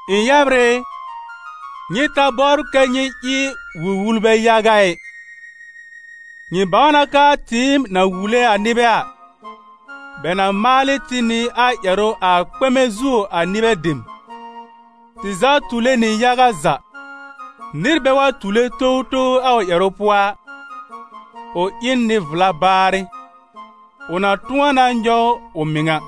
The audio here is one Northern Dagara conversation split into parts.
Ɩ̃ yɛbr ɩ, nyɩ ta bɔbr kɛ́ nyɩ ɩ wul-wulbɛ yaga ɩ. Nyɩ bãw na k'aa tɩɩm na wule a nɩbɛ a, bɛ na maal ɩ tɩ nɩ a ƴɛrʋ a kpɛmɛ zuo a nɩbɛ dem. Tɩ za tule nɩ yaga za. Nɩr bɛ wa tule towtow a ʋ ƴɛrʋ pʋɔ a, ʋ ɩ n nɩ-vla baarɩ, ʋ na tʋ̃ɔ na nyɔw ʋ mɩŋa.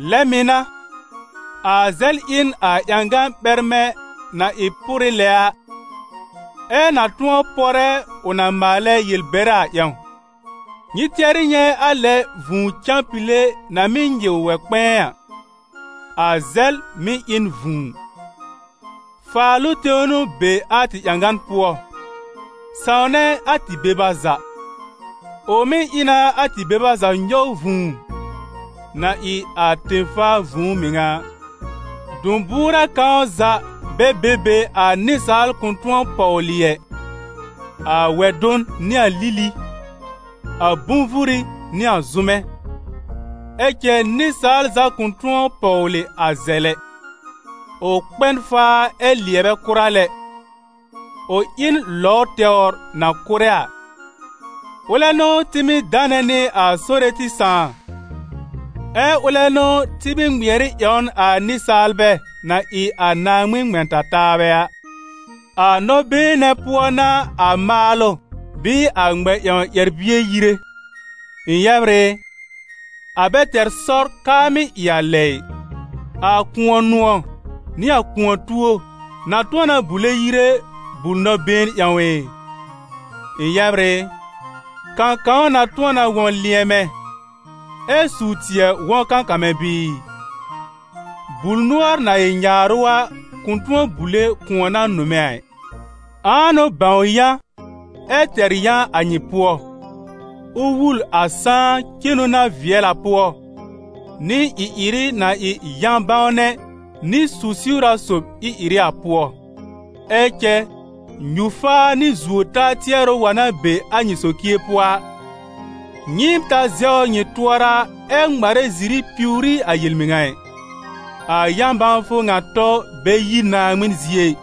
Lɛ mɩ̀ n'a, a zɛl ɩ n a ƴãgan ɓɛrmɛ na ɩ pʋrɩ lɛ a, ɛ na tʋ̃ɔ pɔrɛ ʋ na maalɛ yel-bɛrɛ a ƴãw. Nyɩ tɩɛrɩ nyɛ̃ a lɛ vũu cãpile na mɩ́ nyɩw wɛ-kpɛ̃ɛ a! A zɛl mɩ̀ ɩ n vũu. Faalʋ tẽw n'ʋ be a tɩ ƴãgan pʋɔ, sãwnɛ a tɩ beba za. Ʋ mɩ́ ɩ na a tɩ beba za nyɔw vũu, na ɩ a tẽ-faa vũu mɩŋa a. Dʋ̃-bʋʋrɛ kãw za bɛ be be a nɩsaal kʋ̃ tʋ̃ɔ pɔwlɩ ɛ: a wɛ-dʋn nɩ a lili, a bʋ̃-vuri nɩ a zʋ́mɛ. Ɛ cɛ nɩsaal za kʋ̃ tʋ̃ɔ pɔwlɩ a zɛl ɛ: ʋ kpɛ n faa ɛ lɩɛbɛ kʋra lɛ, ʋ ɩ n lɔw tɛwr na kʋ́rɛ a. Ʋlɛ n'ʋ tɩ mɩ́ danɛ nɩ a Sore tɩ Sãà, ɛ ʋlɛ n'ʋ tɩ mɩ́ ŋmɩɛr ɩ ƴãwn a nɩsaalbɛ na ɩ a Naaŋmɩn ŋmɛ̃-ta-taabɛ a. A nɔ-been nɛ̃ pʋɔ n'a a maalʋ bɩɩ a ŋmɛ-ƴãw ƴɛr-bie yire. Ɩ̃ yɛbr ɩ, a bɛ tɛr sɔr k'aa mɩ́ ɩ a lɛ ɩ. A kʋ̃ɔ-nʋ̃ɔ̀ nɩ a kʋ̃ɔ-tuo na tʋ̃ɔ na bule yire bul-nɔ-been ƴãw ɩ? Ɩ̃ yɛbr ɩ, kãkãw na tʋ̃ɔ na wɔ̃ lɩ̃ɛmɛ, ɛ suw-tɩɛ wɔ̃ kãkamɛ bɩɩ? Bul-nʋɔr na ɩ nyaarʋ a kʋ̃ tʋ̃ɔ bule kʋ̃ɔ na nʋmɛ a ɩ. Ãa n'ʋ bãw yã ɛ tɛr yã a nyɩ pʋɔ? Ʋ wul a sãá cenu na vɩɛl a pʋɔ, nɩ ɩ-ɩrɩ na ɩ yã-bãwnɛ nɩ su-siwra sob ɩ-ɩrɩ a pʋɔ. Ɛ cɛ nyu-faa nɩ zuo-taa tɩɛrʋ wa n'a be a nyɩ socie pʋɔ a, nyɩɩm ta zɛwr nyɩ tʋɔra ɛ ŋmarɛ ziri piwr ɩ a yel-mɩŋa ɩ. A yã-bãwfʋ ŋa tɔ bɛ yi Naaŋmɩn zie ɩ;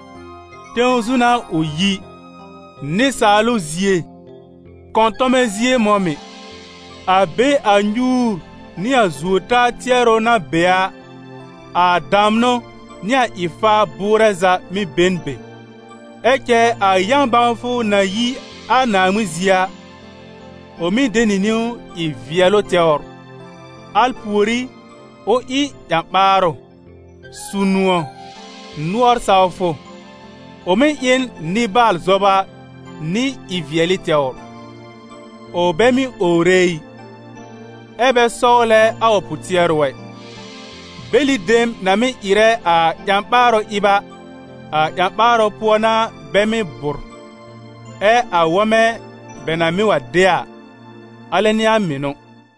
tẽw zu n'a ʋ yi, nɩsaalʋ zie, kɔ̃tɔmɛ zie mɔ̃ mɩ̀. A be a nyuur nɩ a zuo-taa tɩɛrʋ na be a, a damnʋ nɩ a ɩ-faar bʋʋrɛ za mɩ̀ be n be. Ɛ cɛ a yã-bãwfʋ na yi a Naaŋmɩn zie a, ʋ mɩ̀ de nɩ niwn ɩ vɩɛlʋ tɛwr; al pùorí ʋ ɩ ƴã-ɓaarʋ, su-nʋ̃ɔ̀, nʋɔr sawfʋ; ʋ mɩ́ ɩ n nɩbaal-zɔba nɩ ɩ-vɩɛlɩ tɛwr; ʋ bɛ mɩ́ owre ɩ, ɛ bɛ sɔwlɛ a ʋ pʋ-tɩɛrʋ ɛ. Bɛlɩ dem na mɩ́ ɩrɛ a ƴã-ɓaarʋ ɩb a, a ƴã-ɓaarʋ pʋɔ n'a bɛ mɩ́ bʋ̀r, ɛ a wɔmɛ bɛ na mɩ́ wa de a, alɛ n'ɩ a mɩnʋ.